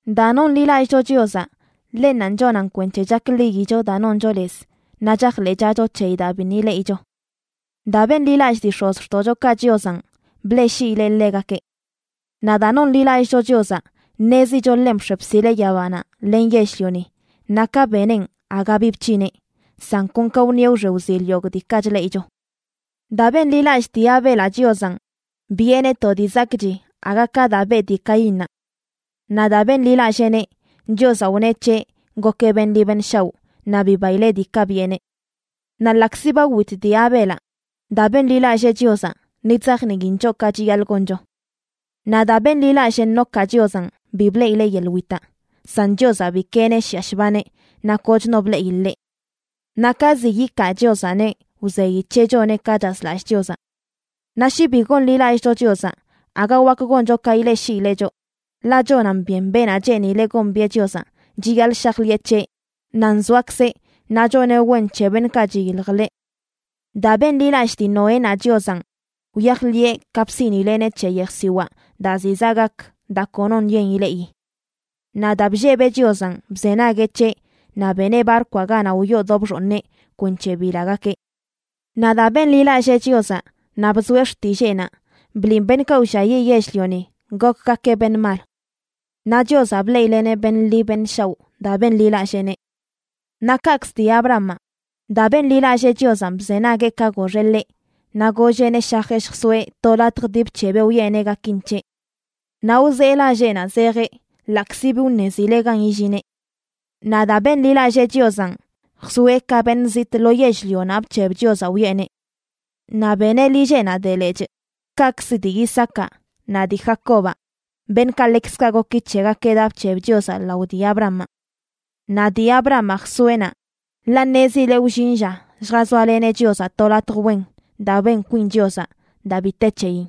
Daa nonḻilallꞌcho Chiozaꞌ, ḻennanꞌ chonan kwenc̱he chakḻiyicho daa noncho lez naꞌ chajḻeꞌchacho c̱heyi daa biṉꞌ ileꞌicho. Daa benḻilallꞌ dii x̱ozxtoꞌchokaꞌ Chiozanꞌ, bleꞌshiileꞌ ḻegakeꞌ. Naꞌ daa nonḻilallꞌcho Chiozaꞌ, ṉezicho ḻenꞌ bx̱e bsileꞌ yabanaꞌ len yell-lioni naꞌ ka beneꞌn aga bi bc̱hineꞌ, san kon ka wṉieꞌ wxe wzil yogꞌ diikaꞌ chleꞌicho. Daa benḻilallꞌ dii Abelaꞌ Chiozanꞌ, biꞌeneꞌ to dii zakꞌchi aga ka daa beꞌ dii Caínnaꞌ. Naꞌ daa benḻilalleeneꞌ, Chiozaꞌ wneꞌ c̱heꞌ gokeꞌ beṉꞌ ḻi beṉꞌ shaoꞌ naꞌ bibaileꞌ diikaꞌ biꞌeneꞌ. Naꞌ ḻaꞌkzi ba wit dii Abelaꞌ, daa benḻilallee Chiozaꞌ ni chzajniin choꞌ ka chiyaḻꞌ goncho. Naꞌ daa benḻilallꞌ Enocaꞌ Chiozanꞌ, bi bleꞌileꞌ yeḻꞌ witaꞌ, san Chiozaꞌ bikeeneꞌ shiꞌa shbaneꞌ naꞌ koch no bleꞌi ḻeꞌ. Naꞌ ka ziꞌ yikaa Chiozaꞌneꞌ wzeyi c̱heꞌ choneꞌ ka chazlallꞌ Chiozaꞌ. Naꞌ shi bi gonḻilallꞌcho Chiozaꞌ, aga wak goncho ka ileꞌshiileꞌ choꞌ, ḻaꞌ chonan byen beenaꞌ cheenileꞌ gombiꞌe Chiozaꞌ chiyaḻꞌ shajḻiꞌe c̱heꞌ nan zoakzeꞌ naꞌ choneꞌ wen c̱he beṉꞌkaꞌ chiyilj ḻeꞌ. Daa benḻilallꞌ dii Noénaꞌ Chiozanꞌ, wyajḻiꞌe ka bsiꞌnileꞌneꞌ c̱he yejsiwaa daa ziꞌ zaꞌ gak daa konoṉꞌ yen ileꞌi. Naꞌ daa bllebeꞌ Chiozanꞌ, bzenagueꞌ c̱heꞌ naꞌ beneꞌ barkwaꞌ ganaꞌ wyoo do bxooṉeꞌ kwenc̱he bilagakeꞌ. Naꞌ daa benḻilallee Chiozaꞌ naꞌ bzoeꞌ xtilleenaꞌ, bliꞌn beṉꞌkaꞌ wlliayiꞌ yell-lioni gokgakeꞌ beṉꞌ mal. Naꞌ Chiozaꞌ bleꞌileꞌneꞌ beṉꞌ ḻi beṉꞌ shaoꞌ daa benḻilalleeneꞌ. Naꞌ kaꞌkzə dii Abrahamaꞌ, daa benḻilallee Chiozanꞌ, bzenagueꞌ ka goxeꞌ ḻeꞌ naꞌ golleꞌneꞌ shajeꞌ lljsoeꞌ to latj dii bc̱hebeꞌ wiꞌeneꞌ gakin c̱heꞌ. Naꞌ wzee lalleꞌnaꞌ zejeꞌ ḻaꞌkzi bi wṉezileꞌ gan illineꞌ. Naꞌ daa benḻilallee Chiozanꞌ, jsoeꞌ ka beṉꞌ zitꞌ lo yell-lionaꞌ bc̱heb Chiozaꞌ wiꞌeneꞌ. Naꞌ beneꞌ lilleꞌnaꞌ de lechꞌ, kaꞌkzə dii Isaacaꞌ naꞌ dii Jacobaꞌ, beṉꞌkaꞌ ḻekzkaꞌ goki c̱hegakeꞌ daa bc̱heb Chiozaꞌ lao dii Abrahamaꞌ. Naꞌ dii Abrahamaꞌ jsoeꞌ naꞌ, ḻaꞌ ṉezileꞌ wllin lla lljazoaleneꞌ Chiozaꞌ to latj wen daa ben kwin Chiozaꞌ, daa bi te c̱heyin.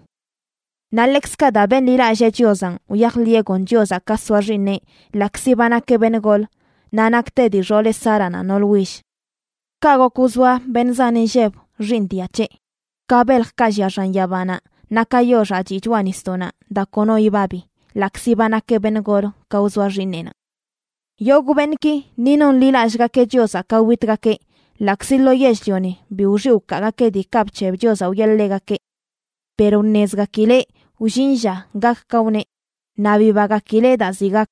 Naꞌ ḻekzkaꞌ daa benḻilallee Chiozanꞌ, wyajḻiꞌe gon Chiozaꞌ ka soa xiiṉeꞌ ḻaꞌkzi ba nakeꞌ beṉꞌ gol naꞌ nakte dii xooleꞌ Sáranaꞌ nool will. Kaꞌ gok wzoa beṉꞌ zan inlleb xiiṉ dia c̱heꞌ, ka beljkaꞌ llia xan yabanaꞌ naꞌ ka yoxaꞌ chiꞌ choꞌa nisdoꞌnaꞌ daa kono ibabi, ḻaꞌkzi ba nakeꞌ beṉꞌ gol ka wzoa xiiṉeꞌnaꞌ. Yogꞌ beṉꞌki ni nonḻilallꞌgakeꞌ Chiozaꞌ ka witgakeꞌ ḻaꞌkzi lo yell-lioni bi wxiꞌ wkaagakeꞌ diikaꞌ bc̱heb Chiozaꞌ wiꞌe ḻegakeꞌ. Per wṉezgakileꞌ wllin lla gak ka wneꞌ, naꞌ bibagakileꞌ daa ziꞌ gak.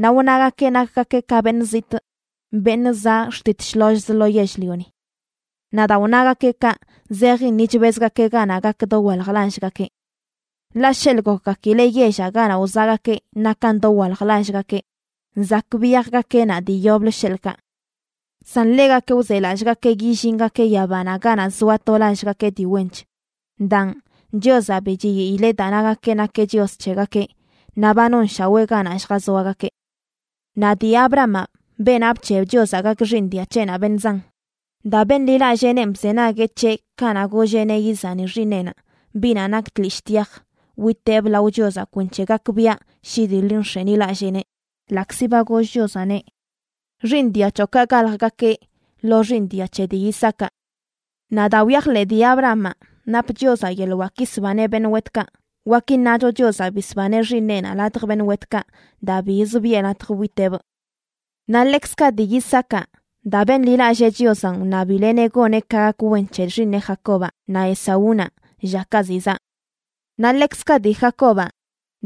Naꞌ wnagakeꞌ nakgakeꞌ ka beṉꞌ zitꞌ, beṉꞌ zaꞌ xtit shlollz lo yell-lioni. Naꞌ daa wnagakeꞌ kaꞌ, zejin ni chbezgakeꞌ ganaꞌ gak dowalj lallgakeꞌ. Ḻaꞌ sheḻꞌ gokgakileꞌ yellaꞌ ganaꞌ wzaꞌgakeꞌ nakan dowalj lallgakeꞌ, zak biyajgakeꞌ naꞌ dii yoblə sheḻꞌkaꞌ. San ḻegakeꞌ wzelallꞌgakeꞌ yillingakeꞌ yabanaꞌ ganaꞌ zoa to lallgakeꞌ dii wench. Daan, Chiozaꞌ bi chiyiileꞌ daa nagakeꞌ nakeꞌ Chios c̱hegakeꞌ, naꞌ ba nonshawee ganaꞌ lljazoagakeꞌ. Naꞌ dii Abrahamaꞌ, beenaꞌ bc̱heb Chiozaꞌ gak xiiṉ dia c̱heꞌnaꞌ beṉꞌ zan, daa benḻilalleenenꞌ bzenagueꞌ c̱heꞌ kanaꞌ golleꞌneꞌ izani xiiṉeꞌnaꞌ, biꞌnaꞌ nak tlishꞌ tyaj, witeꞌb lao Chiozaꞌ kwenc̱he gakbiaꞌ shi dii ḻi nx̱enilalleeneꞌ, ḻaꞌkzi ba goll Chiozaꞌneꞌ: “Xiiṉ dia c̱hoꞌkaꞌ galjgakeꞌ lo xiiṉ dia c̱he dii Isaacaꞌ.” Naꞌ daa wyajḻeꞌ dii Abrahamaꞌ nap Chiozaꞌ yeḻꞌ wak yisbaneꞌ beṉꞌ wetkaꞌ, wak iṉacho Chiozaꞌ bisbaneꞌ xiiṉeꞌnaꞌ ladj beṉꞌ wetkaꞌ daa biz biꞌe latj witeꞌbꞌ. Naꞌ ḻekzkaꞌ dii Isaacaꞌ, daa benḻilallee Chiozanꞌ, wṉabileꞌneꞌ goneꞌ ka gak wen c̱he xiiṉeꞌ Jacobaꞌ naꞌ Esaúnaꞌ llakaꞌ ziꞌ zaꞌ. Naꞌ ḻekzkaꞌ dii Jacobaꞌ,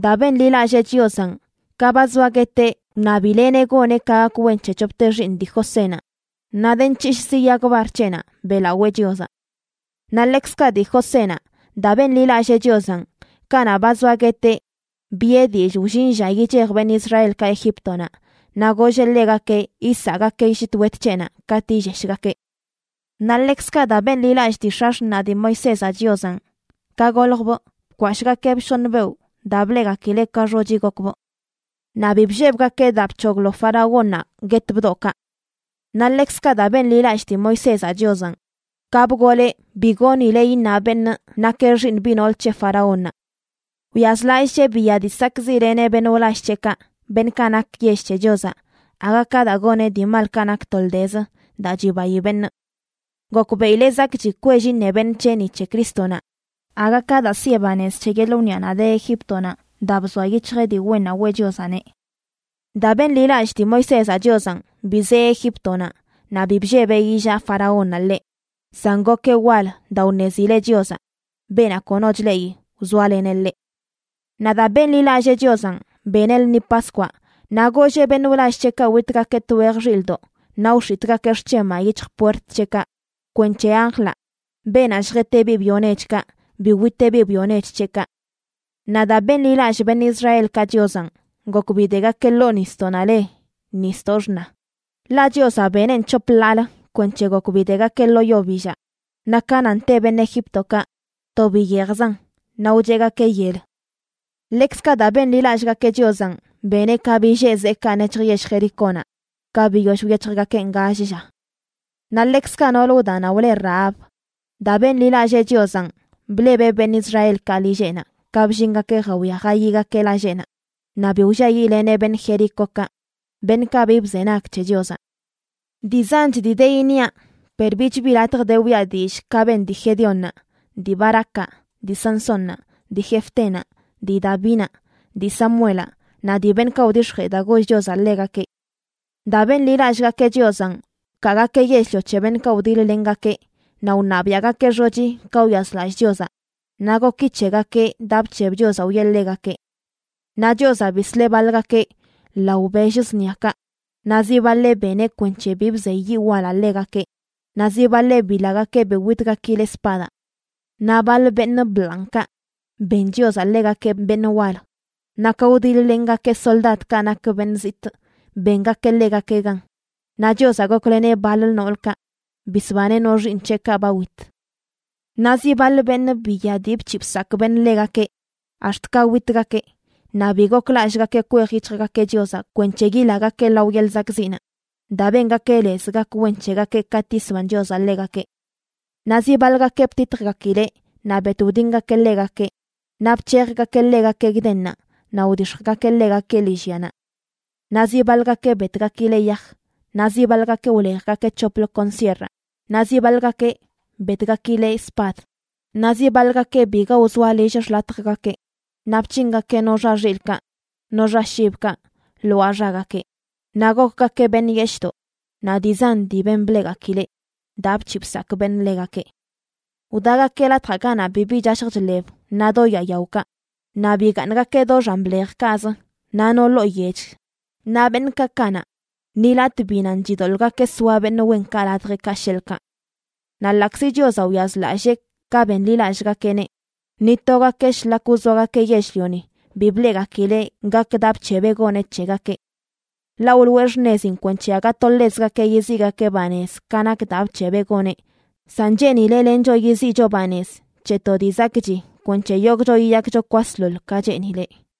daa benḻilallee Chiozanꞌ, ka ba zoa gueteꞌ wṉabileꞌneꞌ goneꞌ ka gak wen c̱he c̱hopte xiiṉ dii Josénaꞌ, naꞌ de nc̱hishꞌzi yag bar c̱heꞌnaꞌ beꞌlawee Chiozaꞌ. Naꞌ ḻekzkaꞌ dii Josénaꞌ, daa benḻilallee Chiozanꞌ, kanaꞌ ba zoa gueteꞌ, biꞌe dillꞌ wllin lla yichej beṉꞌ Israelkaꞌ Egíptonaꞌ, naꞌ golleꞌ ḻegakeꞌ yisaꞌgakeꞌ llit wet c̱heꞌnaꞌ katꞌ yilleshgakeꞌ. Naꞌ ḻekzkaꞌ daa benḻilallꞌ dii x̱axṉaꞌ dii Moisézaꞌ Chiozanꞌ, ka goljbꞌ bkwashꞌgakeebꞌ shoṉ beoꞌ daa bleꞌgakileꞌ ka xochi gokbꞌ. Naꞌ bi bllebgakeꞌ daa bc̱hoglo faraónnaꞌ guet bdoꞌkaꞌ. Naꞌ ḻekzkaꞌ daa benḻilallꞌ dii Moisézaꞌ Chiozanꞌ, ka bgoleꞌ bi goonileꞌ iṉa beṉꞌ nakeꞌ xiiṉ biꞌ nool c̱he faraónnaꞌ. Wyazlallꞌcheꞌ biya dii sakꞌziꞌleneꞌ beṉꞌ wlall c̱heꞌkaꞌ, beṉꞌkaꞌ nak yell c̱he Chiozaꞌ, aga ka daa goneꞌ dii malkaꞌ nak toldezə daa chibayi beṉꞌ. Gokbeꞌileꞌ zakꞌchi kwell iṉe beṉꞌ c̱heꞌ ni c̱he Crístonaꞌ, aga ka daa siꞌe banez c̱he yeḻꞌ wniꞌanaꞌ de Egíptonaꞌ, daa bzoa yic̱hjeꞌ dii wennaꞌ weꞌ Chiozaꞌneꞌ. Daa benḻilallꞌ dii Moisézaꞌ Chiozanꞌ, bizee Egíptonaꞌ naꞌ bi bllebeꞌ illaa faraónnaꞌ ḻeꞌ, san gokeꞌ wal daa wṉezileꞌ Chiozaꞌ, beenaꞌ kono chleꞌi, wzoaleneꞌ ḻeꞌ. Naꞌ daa benḻilallee Chiozanꞌ, beneꞌ lṉi Paskwaꞌ. Naꞌ golleꞌ beṉꞌ wlall c̱heꞌkaꞌ witgakeꞌ twej xilꞌdoꞌ naꞌ wx̱itꞌgakeꞌ xc̱hemaꞌ yic̱hj puert c̱heꞌkaꞌ kwenc̱he anjlaꞌ, beenaꞌ lljet biꞌ byo nechkaꞌ, bi witeꞌ biꞌ byo nech c̱heꞌkaꞌ. Naꞌ daa benḻilallꞌ beṉꞌ Israelkaꞌ Chiozanꞌ, gok bidegakeꞌ ḻoo nisdoꞌnaꞌ le Nisdoꞌ Xṉa, ḻaꞌ Chiozaꞌ beneꞌn c̱hop ḻaalə kwenc̱he gok bidegakeꞌ lo yo billaꞌ. Naꞌ ka nan te beṉꞌ Egíptokaꞌ, to biyejzan naꞌ wcheꞌgakeꞌ yel. Ḻekzkaꞌ daa benḻilallꞌgakeꞌ Chiozanꞌ, beneꞌ ka billee zeekaꞌ nec̱hj yell Jericónaꞌ ka biyoll wyec̱hjgakeꞌn gall lla. Naꞌ ḻekzkaꞌ nool wdanaꞌ wle Rahab, daa benḻilallee Chiozanꞌ, blebeꞌ beṉꞌ Israelkaꞌ lilleꞌnaꞌ ka bllingakeꞌ jawia jayigakeꞌ lalleꞌnaꞌ naꞌ bi wlliayiꞌleneꞌ beṉꞌ Jericókaꞌ beṉꞌkaꞌ bi bzenag c̱he Chiozaꞌ. Dii zanch dii de iṉiaꞌ, per bich bi latj de wiꞌa dillꞌ ka ben dii Gedeónnaꞌ, dii Barácaꞌ, dii Sansónnaꞌ, dii Jefténaꞌ, dii Davinaꞌ, dii Samuelaꞌ naꞌ dii beṉꞌkaꞌ wdix̱jee daa goll Chiozaꞌ ḻegakeꞌ. Daa benḻilallꞌgakeꞌ Chiozanꞌ, wkaagakeꞌ yell-lio c̱he beṉꞌkaꞌ wdiḻ-lengakeꞌ, naꞌ wṉabiaꞌgakeꞌ xochi ka wyazlallꞌ Chiozaꞌ, naꞌ goki c̱hegakeꞌ daa bc̱heb Chiozaꞌ wiꞌe ḻegakeꞌ. Naꞌ Chiozaꞌ bisleꞌ baḻgakeꞌ lao bell zṉiakaꞌ, naꞌ zi baḻeꞌ beneꞌ kwenc̱he bi bzey yiꞌ walaꞌ ḻegakeꞌ, naꞌ zi baḻeꞌ bilagakeꞌ bi witgakileꞌ spadaꞌ. Naꞌ baḻ beṉꞌ bḻanꞌkaꞌ, ben Chiozaꞌ ḻegakeꞌ beṉꞌ wal, naꞌ ka wdiḻ-lengakeꞌ soldadkaꞌ nak beṉꞌ zitꞌ, bengakeꞌ ḻegakeꞌ gan. Naꞌ Chiozaꞌ gokleneꞌ baḻ noolkaꞌ, bisbaneꞌ no xiiṉ c̱heꞌkaꞌ ba wit. Naꞌ zi baḻ beṉꞌ biya dii bc̱hiꞌ bsakꞌ beṉꞌ ḻegakeꞌ ax̱t ka witgakeꞌ naꞌ bi goklallꞌgakeꞌ kwej yic̱hjgakeꞌ Chiozaꞌ kwenc̱he yilagakeꞌ lao yeḻꞌ zakꞌziꞌnaꞌ, daa bengakeꞌ lez gak wen c̱hegakeꞌ katꞌ yisban Chiozaꞌ ḻegakeꞌ. Naꞌ zi baḻgakeꞌ btitjgakileꞌ naꞌ bet wdingakeꞌ ḻegakeꞌ, naꞌ bc̱hejgakeꞌ ḻegakeꞌ gdennaꞌ naꞌ wdix̱jgakeꞌ ḻegakeꞌ lillyanaꞌ. Naꞌ zi baḻgakeꞌ betgakileꞌ yaj, naꞌ zi baḻgakeꞌ wlejgakeꞌ c̱hoplə kon sierraꞌ, naꞌ zi baḻgakeꞌ betgakileꞌ spad. Naꞌ zi baḻgakeꞌ biga wzoa lill xḻatjgakeꞌ naꞌ bc̱hingakeꞌ no xa xilꞌkaꞌ no xa shibkaꞌ lwaa xagakeꞌ, naꞌ gokgakeꞌ beṉꞌ yeshꞌdoꞌ naꞌ dii zan dii ben bleꞌgakileꞌ daa bc̱hiꞌ bsakꞌ beṉꞌ ḻegakeꞌ. Wdagakeꞌ latjaꞌ ganaꞌ bibi chashj chḻeb naꞌ do yaa yaokaꞌ, naꞌ bigaaṉgakeꞌ do xan blejkaꞌzə naꞌ no ḻoo yech. Naꞌ beṉꞌkaꞌ kanaꞌ, ni latꞌ bi nan chidoḻꞌgakeꞌ soa beṉꞌ wenkaꞌ ladjeꞌkaꞌ, sheḻꞌkaꞌ. Naꞌ ḻaꞌkzi Chiozaꞌ wyazlallee ka benḻilallꞌgakeꞌneꞌ, ni togakeꞌ shlak wzoagakeꞌ yell-lioni bi bleꞌgakileꞌ gak daa bc̱hebeꞌ goneꞌ c̱hegakeꞌ. Ḻaꞌ wloꞌe xṉezin kwenc̱he aga to ḻezgakeꞌ yiziꞌgakeꞌ banez ka nak daa bc̱hebeꞌ goneꞌ, san cheenileꞌ lencho yiziꞌcho banez c̱he to dii zakꞌchi kwenc̱he yogꞌcho yiyakcho kwasḻoḻ ka cheenileꞌ.